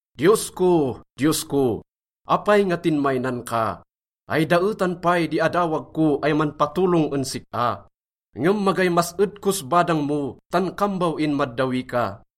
Diyos ko, Diyos ko, apay nga tinmaynan ka? Ay daetan pay di adawag ko ay manpatolong en sik-a, ngem magay mas-ed kos badang mo tan kambaw inmaddawi ka.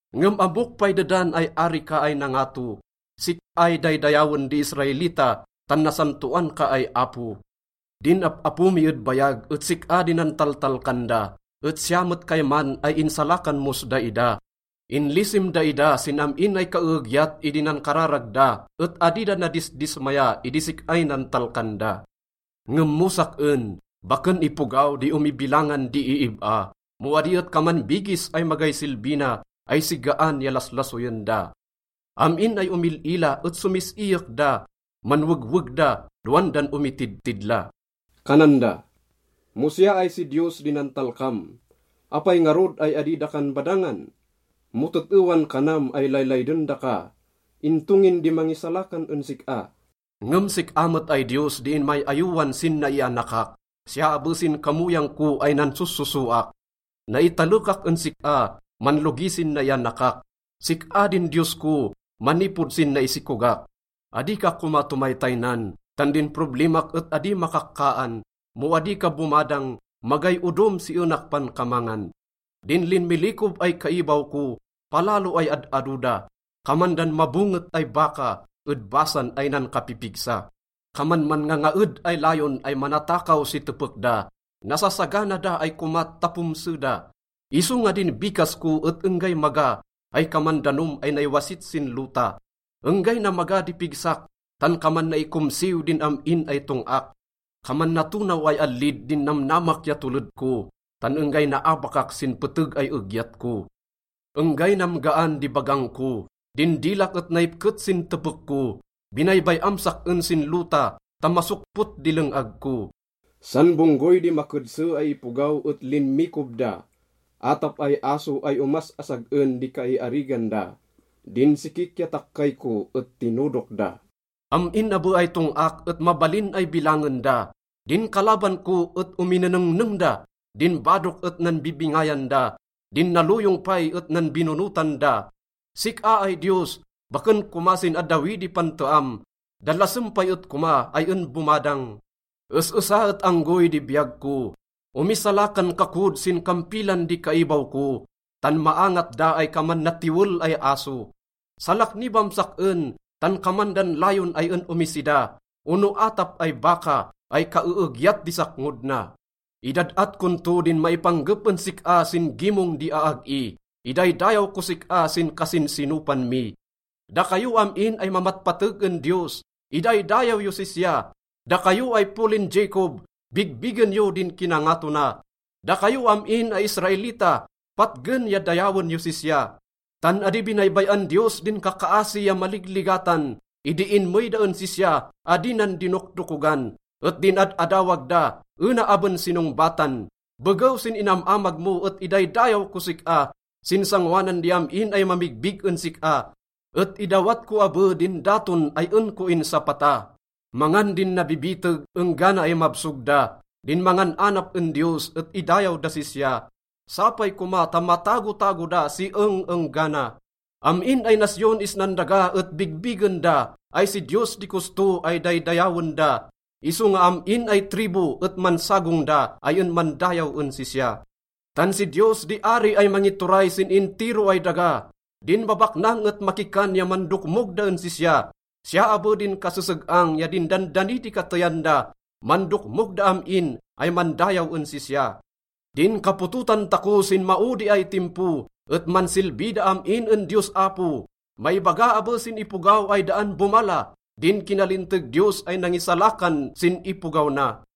Ngem ammok pay dedan ay Ari ka ay nangato. Sik-ay daydayawen di Israelita tan nasantoan ka ay Apo. Din ap-apo mi ed bayag et sik-a di nantaltalkan da et siya met kayman ay insalakan mos daida. Inlisim daida sin am-in ay kaeegyat idi nankararag da et adi da nadisdismaya idi sik-ay nantalkan da. Ngem mo sak-en, baken ipogaw di omibilangan di iib-a mo adi et kaman bigis ay magay silbi na ay sigaan ya laslasoyen da. Am-in ay omil-ila et somis-iyek da. Manwegweg da dowan dan omitidtidla. Kanan da, “Mo siya ay si Diyos di nantalkam, apay ngarud ay adi dakan badangan? Mo tet-ewan kanam ay laylayden daka, into ngin di mangisalakan en sik-a?” Ngem sik-a met ay Diyos di inmay-ayowan sin naianakak, siya abe sin kamoyang ko ay nansossosoak. Naitalekak en sik-a manlogi sin naianakak, sik-a din Diyos ko manipod sin naisikogak. Adi ka koma tomaytaynan tan din problimak et adi makakkaan. Mo adi ka bomadang, magay odom si enak pankamangan. Din linmilikob ay kaibaw ko, palalo ay ad-ado da. Kaman dan mabonget ay baka ed Basan ay nankapipigsa. Kaman manngangaed ay layon ay manatakaw si tepek da, nasasagana da ay komat ta pomse da. Isonga din bikas ko et enggay maga ay kaman danom ay naiwasit sin lota. Enggay namaga di pigsak, tan kaman naikomsiw din am-in ay tong-ak. Kaman natonaw ay allid din namnamak ya toled ko, tan enggay naabakak sin peteg ay egyat ko. Enggay namgaan di bagang ko, din dilak et naipket sin tepek ko. Binaybay-am sak-en sin lota ta masokpot di leng-ag ko. San bonggoy di makedse ay ipogaw et linmikob da, atap ay aso ay omas-asag-en di kaiarigan da. Din sikik ya takkay ko et tinodok da. Am-in abe ay tong-ak et mabalin ay bilangen da, din kalaban ko et ominenengneng da. Din badok et nanbibingayan da, din naloyong pay et nanbinonotan da. Sik-a ay Diyos, baken koma sin addawi di panteam, dalasem pay et koma ay en bomadang. Es-esa et anggoy di biyag ko, omisalakan ka kod sin kampilan di kaibaw ko, tan maangat da ay kaman natiwel ay aso. Salaknibam sak-en tan kaman dan layon ay en omisida ono atap ay baka ay kaeegyat di sakngod na. Idad-at kon to din maipanggep en sik-a sin gimong di aag-i, idaydayaw kos sik-a sin kasinsinopan mi: “Dakayo am-in ay mamatpateg en Diyos, idaydayaw yos sisya, dakayo ay polin Jacob, bigbigen yo din kinangato na. Dakayo am-in ay Israelita, patgen ya dayawen yos sisya. Tan adi binaybay-an Diyos din kakaasi ya maligligatan, idi inmey da en sisya, adi nan dinokdokogan, et din ad-adawag da, ena aben sinongbatan.” Begew sin inam-amag mo et idaydayaw kos sik-a sin sangoanan di am-in ay mamigbig en sik-a, et idawat ko abe din daton ay en ko insapata. Mangan din nabibiteg enggana ay mabsog da, din mangan-anap en Diyos et idayaw das sisya, sapay koma ta matagotago da si eng-enggana. Am-in ay nasyon isnan daga et bigbigen da ay si Diyos di kosto ay daydayawen da, isonga am-in ay tribu et mansagong da ay en mandayaw en sisya. Tan si Diyos di ari ay mangituray sin intiro ay daga. Din babaknang et makikan ya mandokmog da en sisya, siya abe din kaseseg-ang ya din dandani di kateyan da, mandokmog da am-in ay mandayaw en sisya. Din kapototan tako sin maodi ay timpo et mansilbi da am-in en Diyos Apo. Maibaga abe sin ipogaw ay daan bomala din kinalinteg Diyos ay nangisalakan sin ipogaw na.